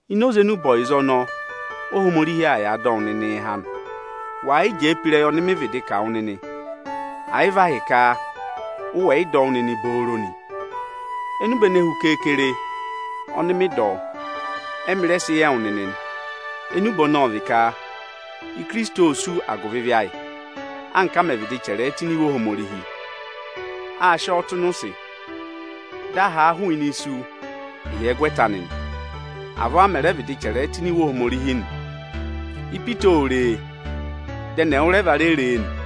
Ini oze enube ọyịza ọnọọ Ohomorihi aa yàa dọ wụ nịnịị há nị, wàa yị jẹẹ pe ịrẹyị ọnị mị vịdị kà wụ nịnị, àyị vị ahịka ụ wẹ̀ yị dọ wụ́ nịnị booro nị. Enube ene hu keekere ọnị mị dọ, ẹ́mị rẹ sị yị ẹwụ nịnị nị. Enube ọnọọ ọ vị ka Ikirisiti ô sú agụvị ịvị ayị, anka a mẹ̀ vịdị chẹrẹ ẹ tụ́ ini Iwe Ohomorihi. Â sị ọọ tụ́ ịnị ụsị, dị a haa hụụnị isu ịhyẹgwẹta anị nị. Avọọ a mẹ̀ rẹ vịdị chẹrẹ ẹ tụ́ ini Iwe Ohomorihi nị. Ipita ô re e, dị ẹnị ẹwụrẹva re re e nị.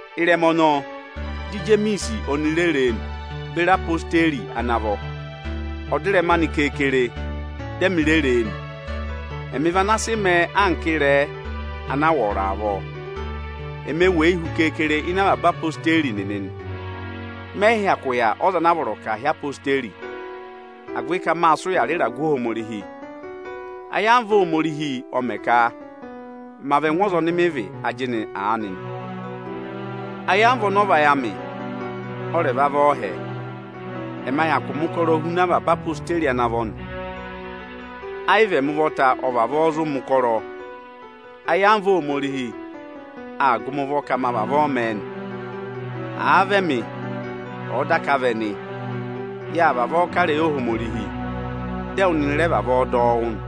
Ịrẹma ọnọọ, dị Ijemiisi oni re re e nị, beri ezirẹma Ijeesu ana vọ nị. Ọdịrẹma anị keekere, dị ẹmị re re e nị. Ẹmị vị ana sị mẹẹ anka ịrẹẹ anaa wọrọ avọọ. Eme weyi hu keekere ịnị avaba ezirẹma Ijeesu nịnị nị. Mẹ yị hyakụ yà ọza anaa vọrọ ka àa hị́ ezirẹma Ijeesu, agụvị ka mâ sị ụya rị ịragụ Ohomorihi. Ayamva Ohomorihi ọ mẹ ka ma vị ẹngụ ọza ọnị mị vị ajịnị aanị nị. Ayamva ọnị ọ vayị amị ọ rẹ̀ vaa vị ọọhẹ. Ẹma hyakụ mẹ̀ ụkọrọ huna avaba ezirẹma Ijeesu ana vọ nị. Ayị vị ẹmị ụvọta ọ vavọọ zụ mẹ̀ ụkọrọ, ayamva Ohomorihi aa gụ mị ụvọ ka ma vavọọ mẹẹ nị. Àa vị ẹmị, ọ̀ọ daka vị ẹnị, yâ vavọọ kà ịrẹyị Ohomorihi, dị ẹwụ nịnị rẹ vavọọ dọ ọ wụ́ nị.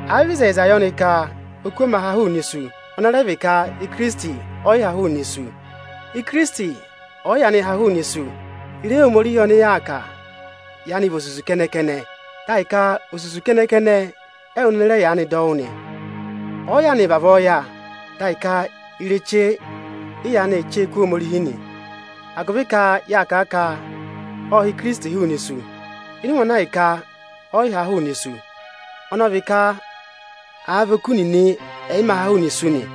Àa vị ịzẹyịza yọ nị ka oku ọ mā ha hụụnị isu, ọnị ọ rẹ vị ka Ikirisiti ọ yị ha hụụnị isu. Ikirisiti ọ̀ yị yaanị ha hụụnị isu, ịrẹyị Ohomorihi ọnị yaa kà yaanị vị osusu kẹnẹ-kẹnẹ, dị ahịka osusu kẹnẹ-kẹnẹ ẹwụ nịnị rẹ yaanị dọ wụ́ nị. Ọ̀ọ yaanị vavọọ yà, dị ahịka ireche ị yaanị ee chee kú Ohomorihi nị, agụvị ka yâ kà a ka ộ ha Ohinọyị oni Ọ nyị ka ọ̀ dọ yị há hụụnị isu, ịnị ụmẹ ana ahịka ọ yị ha a hụụnị isu; ọnọọ ọ vị ka oku nịnị ẹ yị mā ha hụụnị isu nị.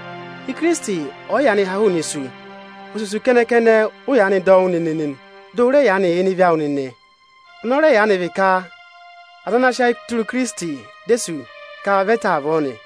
Ikirisiti ọ̀ yị yaanị ha hụụnị isu, osusu kẹnẹ-kẹnẹ ụ yaanị dọ wụ́ nịnị nị, dị ụ rẹ yaanị yà ịnị ịvị awụ nịnị. Ọnị ọ rẹ yaanị vị ka aza ana sị ayị tụra Ikirisiti dị e sú, ka vị ẹ ta avọọ nị.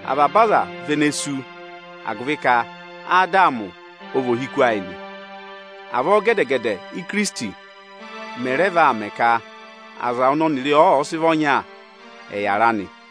Avaba aza vị ene ee sú agụvị ka Adamị ọ vị ohiku ayị nị. Avọọ gẹdẹ-gẹdẹ Ikirisiti mẹ̀ rẹ vaa mẹ ka aza ọnị ọnịrịị sị vị ọnya, ẹ̀ yàra nị.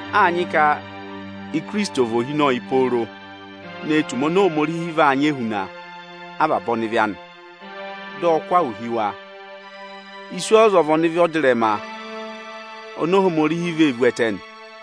Â nyị ka Ikirisiti, ọ̀ mẹ ohinọyị pooro ne tù ụmẹ oni Ohomorihi vaa nyị ehuna avaba ọnịvị anị, dị ọ kụ́ ahụ hi wa. Iswọọza ọ vị ọnịvị ọdịrẹma oni Ohomorihi vee vu ẹtẹ nị.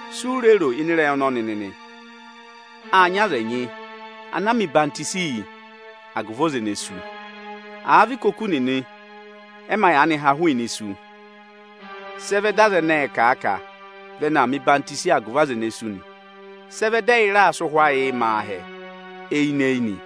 Si u re ro ịnị ịrẹyị ọnọnị nịnị? Â nyị aza ẹnyị ana mẹ ọyịhwenyi yị agụvị ọza ene sú. Àa vị ka oku nịnị ẹ mā yaanị ha hụụnị isu, sị ẹ vẹ dị aza ẹnẹẹ̄ kà a ka vị ẹnị aa mẹ̀ ọyịhwọzenyi agụvị aza ene sú nị? Sị ẹ vẹ dị ẹyị raa sị ụhwẹ ayịị mẹ aahẹ eyinị-eyinị?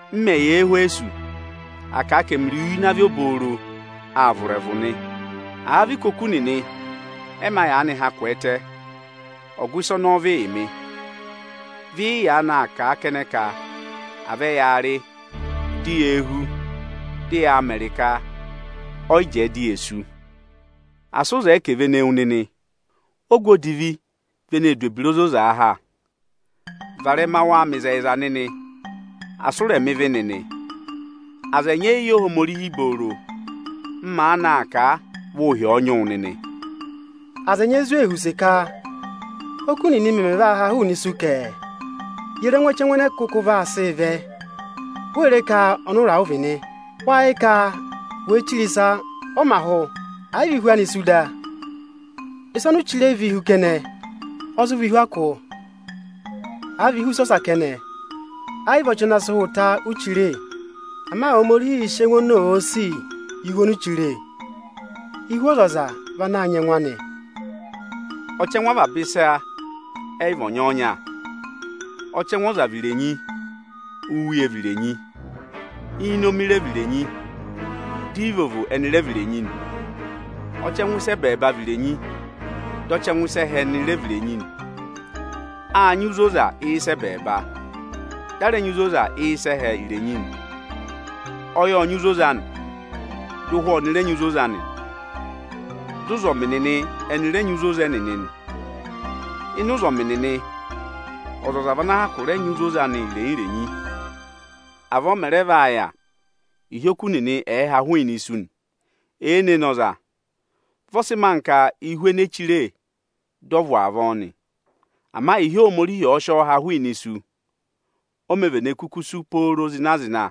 M mẹ̀ yà Ẹhwẹsọsị, à kà a ka ẹmịrị uye ịnị avị obooro aa vụ̀ ịrẹvụ nị. Àa vị ka oku nịnị ẹ yị mā yaanị ha kwẹẹtẹ, ọgụ ịsị ọnọọ vị yị mị? Vị ị yaanị aa kà a kẹnẹ ka à vẹ yaa rị, di yee hú, dị yaa mẹrị ka, ọ yị jẹẹ di ye sú ni. Asị ụ zẹẹ ka è vene wu nịnị! Ogu odivi vị eneē du ebira ozozaa ha, Varẹma waa mẹ ịzẹyịza nịnị, asị ụ rẹ̀ mẹ̀ ebira odivi nịnị! Aza ẹnyị ẹ yị yẹ Ohomorihi vụrụ-vụrụ. M maanị aa kà a, vị ụhị ọ̀ nyị wụ nịnị. Aza ẹnyị ẹ zụ ee họ̀ use ka: Óku nịnị mẹmẹ vaa haa hụụnị isu kẹ? Ye re ẹngụ ọchẹngụ ẹnẹ kụkụ vaa sị vẹ? Wee re ka ọnụra ụ vị nịnị nị? Wáá yẹ ka wèe chire ịsa, ọ mā hụ, ẹ̀ yị vị ihu anị sú da? Ịsa oni u chire vị ihu kẹnẹ, ọ zụ vị ihu akụ, à vị ihu ịsa ọsa kẹnẹ. Ẹ yị vị ọchị ana sị hụ ta, uū chire. Ama Ohomorihiī sị ẹngụ oni òo sì yị ihu oni u chire. Ihu ọzọza vị ana nyị ẹngụ anị. Ọchẹngụ avaba ịsa ẹ yị vị ọnyọọnya. Ọchẹngụ ọza vị irenyi, úuye vị irenyi, íinomi rẹ vị irenyi, di íivovo ẹnị rẹ vị irenyi nị. Ọchẹngụ ịsa ene hi ẹbẹẹba vị irenyi, dị ọchẹngụ ịsa ẹhẹ ẹnị rẹ vị irenyi nị. Â nyị uzoza ịsa ẹbẹẹba, dị a rẹ nyị uzoza ịsa ẹhẹ irenyi nị. Ọyị ộ nyị uzoza anị, dị ụhwẹ ọnị rẹ nyị uzoza anị, dị ụzọmị nịnị ẹnị rẹ nyị uzoza ẹnịnị nị. Ịnị ụzọmị nịnị, ọzọza vị ana hyakụ rẹ nyị uzoza anị irenyi-irenyi. Avọọ ọ mẹ̀ rẹ yà, ịhị oku nịnị ẹ̀ẹ ha hụụnị isu nị. Èene ne ọza, vị ọ sị mẹẹ anka ihu ene eē chire dị ọ vụ̀ avọọ nị. Ama ịhị Ohomorihi ọ̀ọ sị ọ ha hụụnị isu, o mē vene kuku sú pooro zịna-zịna.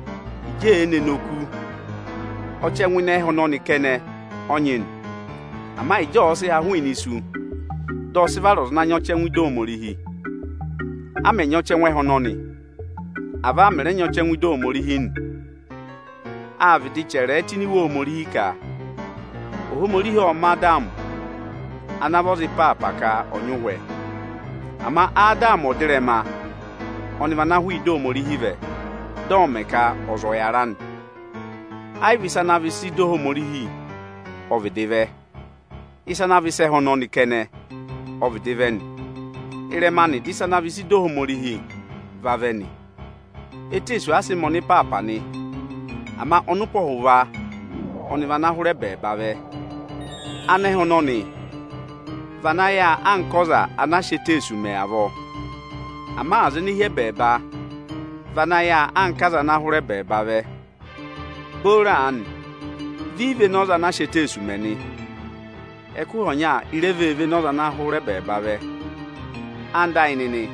Ịjị ee nee ne oku, ọchẹngụ ịnị ẹhẹ ọnọnị kẹnẹ ọ nyị nị; ama ịjị ọ̀ọ sị ha hụụnị isu, dị ọ sị vara ọza ana nyị ọchẹngụ ịdị Ohomorihi. A mẹ̀ nyị ọchẹngụ ẹhẹ ọnọnị, avọọ a mẹ̀ rẹ nyị ọchẹngụ ịdị Ohomorihi nị. Â vịdị chẹrẹ ẹ tụ́ ini Iwe Ohomorihi ka; Ohomorihi ộ mẹ̀ Adamị ana vị ọza ịpaapa ka ọ̀ vị ọza ana yára. Ama Adamị ọdịrẹma vị ana hụụ ịdị Ohomorihi vẹ, ọnị ọọ̄ mẹ̀ ka ọza ọ̀ yàra nị. Ẹ yị vị ịsa ana vị ị sa ịdị Ohomorihi ọ vịdị vẹ. Ịsa ana vị ịsa ẹhẹ ọnọnị kẹnẹ ọ vịdị vẹ nị. Ịrẹma anị dị ịsa ana vị ịsa ịdị Ohomorihi vavẹ nị. Eteesu asị mẹ ọnịpaapa nị, ama ọnụpọhụva ọnị vị ana hụrẹ ẹbẹẹba vẹ. Anẹhẹ ọnọnị vị ana yà anka ọza ana a sị eteesu mẹ avọọ. Ama aza ene hi ẹbẹẹba vị ana yà anka ọza ana hụrẹ ẹbẹẹba vẹ. Booro aanị, vị ị véné ọza ana sị eteesu mẹ nị. Ẹkụhị ọnya i re vee véné ọza ana hụrẹ ẹbẹẹba vẹ. Ẹwụ nịnị ẹyịnyara amị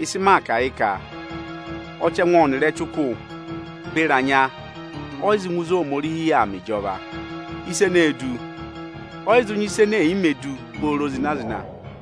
ịsị maa kà yị ka, ọzarẹyịrẹsụ kẹnẹ ọ yị zụ ngụ ịzị Ohomorihi yà aa mẹ ịjọva. Ịsa eneē du, ọ yị zụ nyị ịsa ene è yi me du pooro zịna-zịna.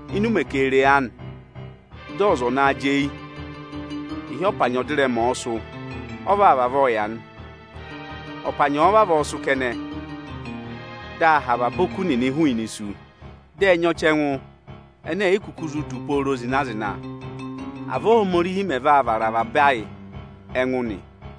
ịnị ụmẹ keere aanị, dị ọza ọ̀ naa jị eyi. Ịhị ọpanyị ọdịrẹma ọ̀ọ sụ́, ọ vavọọ vaa yà nị. Ọpanyị ọ̀ọ vavọọ sụ́ kẹnẹ, dị a ha avaba oku nịnị hụụnị isu, dị ẹ nyị ọchẹngụ ene è yi kuku zụ du pooro zịna-zịna. Avọọ Óhomorihi mẹ vaa vara avaba ayị ẹngụ nị.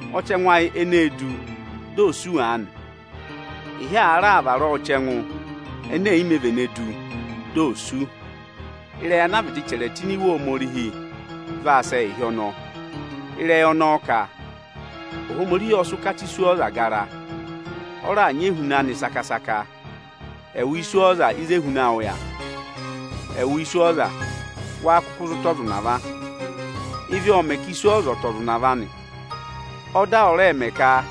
Ọchẹngụ ayị eneē du, dị oō sú aanị, ịhị àa vara a ọchẹngụ ene è yi me vene du, di ò sú, ịrẹyị ana a vịdị chẹrẹ tụ́ ini Iwe Ohomorihi vaa sẹ ịhị ọnọọ. Ịrẹyị ọnọọ ka: Ohomorihi ọ sị ụkata iswọọza gara, ọ raà nyị ehuna anị saka-saka. Ẹwụ iswọọza, ịzị ehuna awụ yà? Ẹwụ iswọọza, wáá kụkụ zụ tụ ọza ụnava? Ịvị ọọ̄ mẹ̀ ka iswọọza ọ̀ọ tụ̀ ọza ụnava nị. Ọda ọ rẹ mẹ ka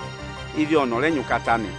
ịvị ọnị ọ̀ rẹ nyị ụkata nị.